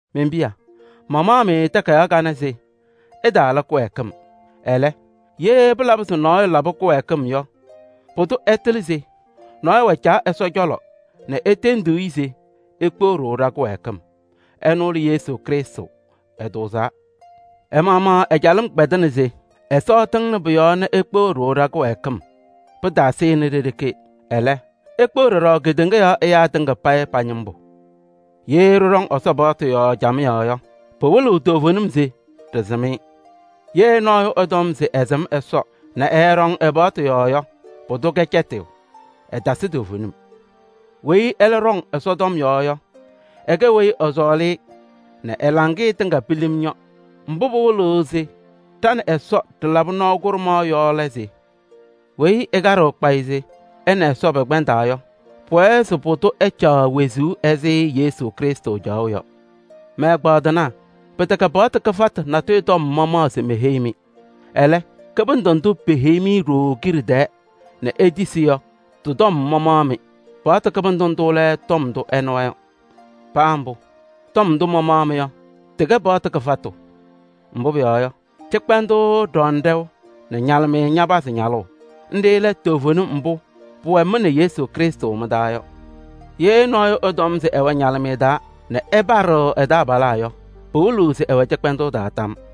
Men-piya! Mamaɣ-mɩ takayaɣ kanɛ se ɩtaala kɩwɛɛkɩm. Ɛlɛ, ye pɩlabɩ se nɔɔyʋ labɩ kɩwɛɛkɩm yɔ, pʋdʋ ɛtɩlɩ se nɔɔyʋ wɛ Caa Ɛsɔ cɔlɔ nɛ etendiɣ-i se ekpeɣ-ɖʋ ɖa-kɩwɛɛkɩm. Ɛnʋ lɛ Yesu Krɩstʋ, ɛtʋʋzaa. Ɛ-maɣmaɣ ɛ-calɩm kpɛdɩnɩ se Ɛsɔ ɛtɩŋnɩ pʋ-yɔɔ nɛ ekpeɣ-ɖʋ ɖa-kɩwɛɛkɩm. Pɩtaasɩnɩ ɖe-ɖeke, ɛlɛ, ekpeɣ ɖɔɖɔ kedeŋa yɔɔ ɛyaa tɩŋa payɩ pa-ñɩmbʋ. Ye ɖɩɖɔŋ Ɛsɔ paɣtʋ yɔɔ camɩyɛ yɔ, pɩwɩlɩɣ toovenim se ɖɩsɩm-ɩ. Ye nɔɔyʋ ɛtɔm se ɛsɩm Ɛsɔ nɛ ɛɛɖɔŋ ɛ-paɣtʋ yɔɔ yɔ, pʋdʋ kɛ cɛtɩyʋ, ɛtasɩ toovenim. Weyi ɛlɛ ɖɔŋ Ɛsɔ tɔm yɔɔ yɔ, ɛkɛ weyi ɛsɔɔlɩ-ɩ nɛ ɛ-laŋɩyɛ tɩŋa pilim yɔ. Mbʋ pɩwɩlɩɣ se ɖa nɛ Ɛsɔ ɖɩlabɩ nɔɔ kʋɖʋmaɣ yɔ lɛ se: weyi ɛkaɖɩɣ kpayɩ se ɛ nɛ Ɛsɔ pɛkpɛndaa yɔ, pʋwɛɛ se pʋdʋ ɛcaɣ wezuu ɛzɩ Yesu Krɩstʋ caɣʋ yɔ. Mɛ-ɛgbaadɩnaa! Pɩtɛkɛ paɣtʋ kɩfatʋ natʋyʋ tɔm mamaɣ se meheyi-mɩ. Ɛlɛ, kɩbɩndʋ ndʋ peheyi-mɩ ɖooo kiɖe tɛɛ nɛ itisi yɔ, tɩ-tɔm mamaɣ-mɩ. Paɣtʋ kɩbɩndʋ ndʋ lɛ tɔm ndʋ ɩnɩwa yɔ. Paa mbʋ, tɔm ndʋ mamaɣ-mɩ yɔ, tɩkɛ paɣtʋ kɩfatʋ. Mbʋ pʋyɔɔ yɔ, cɩkpɛndʋʋ ɖɔŋnɩ ɖɛʋ nɛ ñalɩmɩyɛ ñapazɩ ñalʋʋ: nɖɩ lɛ toovenim mbʋ pʋwɛ mɩ nɛ Yesu Krɩstʋ mɩ-taa yɔ. Ye nɔɔyʋ ɛtɔm se ɛwɛ ñalɩmɩyɛ taa nɛ ɛpaɖɩɣ ɛ-taabalaa yɔ, pɩwɩlɩɣ se ɛwɛ cɩkpɛndʋʋ taa tam.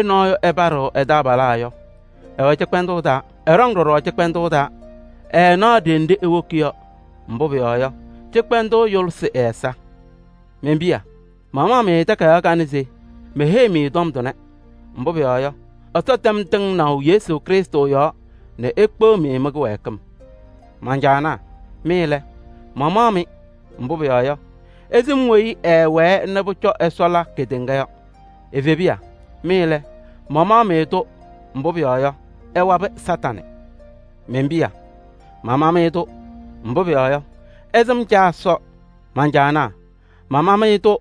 Ye nɔɔyʋ ɛpaɖɩɣ ɛ-taabalaa yɔ, ɛwɛ cɩkpɛndʋʋ taa. Ɛɖɔŋ ɖɔɖɔ cɩkpɛndʋʋ taa, ɛɛnaɣ ɖenɖe ewoki yɔ, mbʋ pʋyɔɔ yɔ, cɩkpɛndʋʋ yʋlɩsɩ ɛ-ɛza. Men-piya! Mamaɣ-mɩ takayaɣ kanɛ se meheyi-mɩ tɔm tʋnɛ, mbʋ pʋyɔɔ yɔ, Ɛsɔ tɛm tɩŋnaʋ Yesu Krɩstʋ yɔɔ nɛ ekpeɣ-mɩ mɩ-kɩwɛɛkɩm. Man-caanaa! Mɩ lɛ, mamaɣ-mɩ, mbʋ pʋyɔɔ yɔ, ɩsɩm weyi ɛɛwɛɛ nɛ pʋcɔ Ɛsɔ la kedeŋa yɔ. Evebiya! Mɩ lɛ, mamaɣ-mɩ-tʋ, mbʋ pʋyɔɔ yɔ, ɩwabɩ Kañadʋ Satanɩ. Men-piya! Mama-mɩ-tʋ, mbʋ pʋyɔɔ yɔ, ɩsɩm Caa Ɛsɔ. Man-caanaa! Mama-mɩ-tʋ,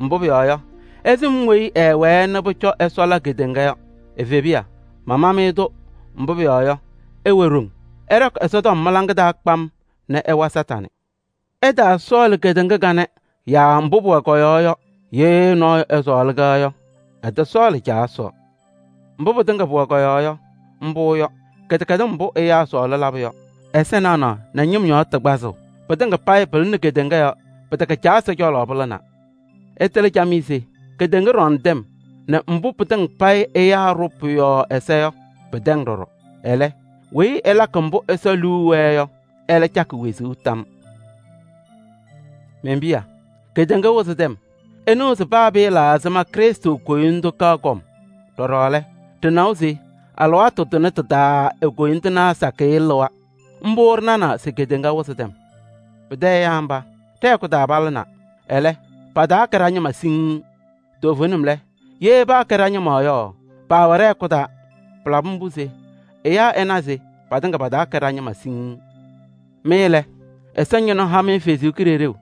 mbʋ pʋyɔɔ yɔ, ɩsɩm weyi ɛɛwɛɛ nɛ pʋcɔ Ɛsɔ la kedeŋa yɔ. Evebiya! Mama-mɩ-tʋ, mbʋ pʋyɔɔ yɔ, ɩwɛ ɖoŋ. Ɩɖɔkɩ Ɛsɔtɔm mɩ-laŋa taa kpam nɛ ɩwa Kañadʋ Satanɩ. Ɩtaasɔɔlɩ kedeŋa kanɛ yaa mbʋ pʋwɛ kɔ-yɔɔ yɔ. Ye nɔɔyʋ ɛsɔɔlɩ-kɛ yɔ, ɛtɔsɔɔlɩ Caa Ɛsɔ. Mbʋ pɩtɩŋa pʋwɛ kɔ-yɔɔ yɔ, mbʋ yɔ: kɩdɛkɛdɩm mbʋ ɛyaa sɔɔlɩ labʋ yɔ, ɛza naɣnaɣ nɛ ñɩm yɔɔ tɩ kpazʋʋ. Pɩtɩŋa payɩ pɩlɩnɩ kedeŋa yɔɔ, pɩtɛkɛ Caa Ɛsɔ cɔlɔ pɩlɩnaa. Ɩtɩlɩ camɩyɛ se kedeŋa ɖɔŋ tɛm nɛ mbʋ pɩtɩŋa payɩ ɛyaa ɖʋʋ pʋ-yɔɔ ɛza yɔ, pɩtɛŋ ɖɔɖɔ. Ɛlɛ, weyi ɛlakɩ mbʋ Ɛsɔ liu wɛɛ yɔ, ɛlɛ cakɩ wezuu tam yɔɔ. Men-piya! Kedeŋa wɩzɩ tɛm! Ɩnɩwa se paa pɩɩla ɛzɩma Krɩstʋ koyindu kaɣ kɔm. Pʋcɔ ɖɩnawa se alɩwaatʋ tʋnɛ tɩ-taa lɛ, e-koyindinaa sakɩyɛ lɩwa. Mbʋ ɖɩnanaa se kedeŋa wɩzɩ tɛm. Pɩtɛ ɛyaa mba, ɖɛ-hɛkʋ taa palɩnaa, ɛlɛ, pataakɛ ɖa-ñɩma siŋŋ. Toovenim lɛ, ye paakɛ ɖa-ñɩma yɔ, paawɛ ɖɛ-hɛkʋ taa. Pɩlabɩ mbʋ se ɛyaa ɛna se patɩŋa pataakɛ ɖa-ñɩma siŋŋ. Mɩ lɛ, Ɛsɔ Ñɩnʋ ha-mɩ ɛ-Kalɩzaɣ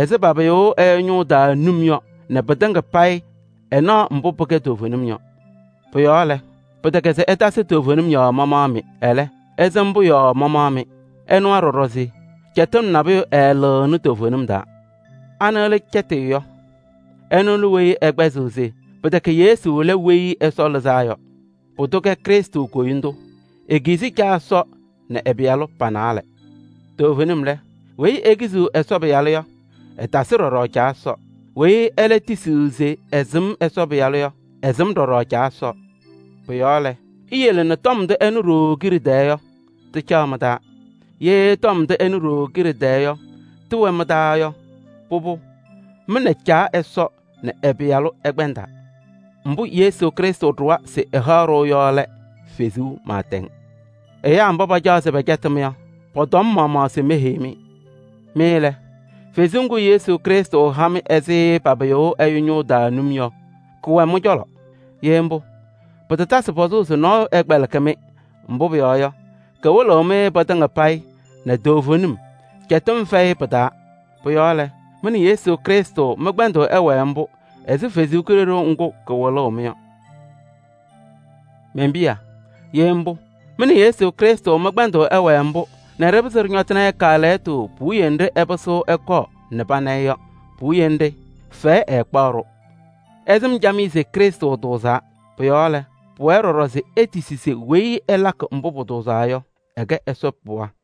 ɛzɩ papɩyʋʋ ɛyʋ ñʋʋ taa num yɔ nɛ mɩtɩŋa payɩ ɩnaɣ mbʋ pɩkɛ toovenim yɔ. Pʋ-yɔɔ lɛ, pɩtɛkɛ se ɩtasɩ toovenim yɔɔ mamaɣ-mɩ. Ɛlɛ, ɩsɩm-pʋ yɔɔ mamaɣ-mɩ. Ɩnawa ɖɔɖɔ se cɛtɩm nabʋyʋ ɛɛlɩɣnɩ toovenim taa. Anɩ lɛ cɛtɩyʋ yɔ? Ɛnʋ lɛ weyi ɛkpɛzɩɣ se pɩtɛkɛ Yesu lɛ Weyi Ɛsɔ Lɩzaa yɔ. Pʋdʋ kɛ Krɩstʋ koyindu: ekizi Caa Ɛsɔ nɛ ɛ-Pɩyalʋ pa-naalɛ. Toovenim lɛ, weyi ekiziɣ Ɛsɔ Pɩyalʋ yɔ, ɛtasɩ ɖɔɖɔ Caa Ɛsɔ. Weyi ɛlɛ tisiɣ se ɛsɩm Ɛsɔ Pɩyalʋ yɔ, ɛsɩm ɖɔɖɔ Caa Ɛsɔ. Pʋ-yɔɔ lɛ, iyele se tɔm ndʋ ɩnɩ ɖooo kiɖe tɛɛ yɔ, tɩcaɣ mɩ-taa. Ye tɔm ndʋ ɩnɩ ɖooo kiɖe tɛɛ yɔ, tɩwɛ mɩ-taa yɔ, pʋbʋ, mɩ nɛ Caa Ɛsɔ nɛ ɛ-Pɩyalʋ ɩkpɛndaa. Mbʋ Yesu Krɩstʋ ɖʋwa se ɛhaɣ-ɖʋ yɔ lɛ: wezuu pɩɩtɛŋ. Ɛyaa mba pacaɣ se pɛcɛtɩ-mɩ yɔ, pɔ-tɔm mamaɣ se meheyi-mɩ. Mɩ lɛ, Kalɩzaɣ ŋga Yesu Krɩstʋ ha-mɩ ɛzɩ papɩyʋʋ ɛyʋ ñʋʋ taa num yɔ, kɛwɛ mɩ-cɔlɔ. Ye mbʋ, pɩtatasɩ pɔzʋʋ se nɔɔyʋ ɛkpɛlɩkɩ-mɩ, mbʋ pʋyɔɔ yɔ, kawɩlɩɣ-mɩ pɩtɩŋa payɩ nɛ toovenim, cɛtɩm fɛyɩ pɩ-taa. Pʋ-yɔɔ lɛ, mɩ nɛ Yesu Krɩstʋ mɩ-kpɛndʋʋ ɛwɛɛ mbʋ ɛzɩ Kalɩzaɣ ŋga kawɩlʋʋ-mɩ yɔ. Men-piya! Ye mbʋ, mɩ nɛ Yesu Krɩstʋ mɩ-kpɛndʋʋ ɛwɛɛ mbʋ nɛ ɖɩpɩzɩ ɖɩñɔtɩnɩ-ɩ kaalɛyɩtʋ puwiye nɖɩ ɛpɩsɩɣ ɛkɔɔ nɛ pana-ɩ yɔ, fɛyɛ ɛtaakpa-ɖʋ. Ɩsɩm camɩyɛ se Krɩstʋ tʋʋzaa. Pʋ-yɔɔ lɛ, pʋwɛɛ ɖɔɖɔ se itisi se weyi ɛlakɩ mbʋ pʋtʋʋzaa yɔ, ɛkɛ Ɛsɔ pɩɣa.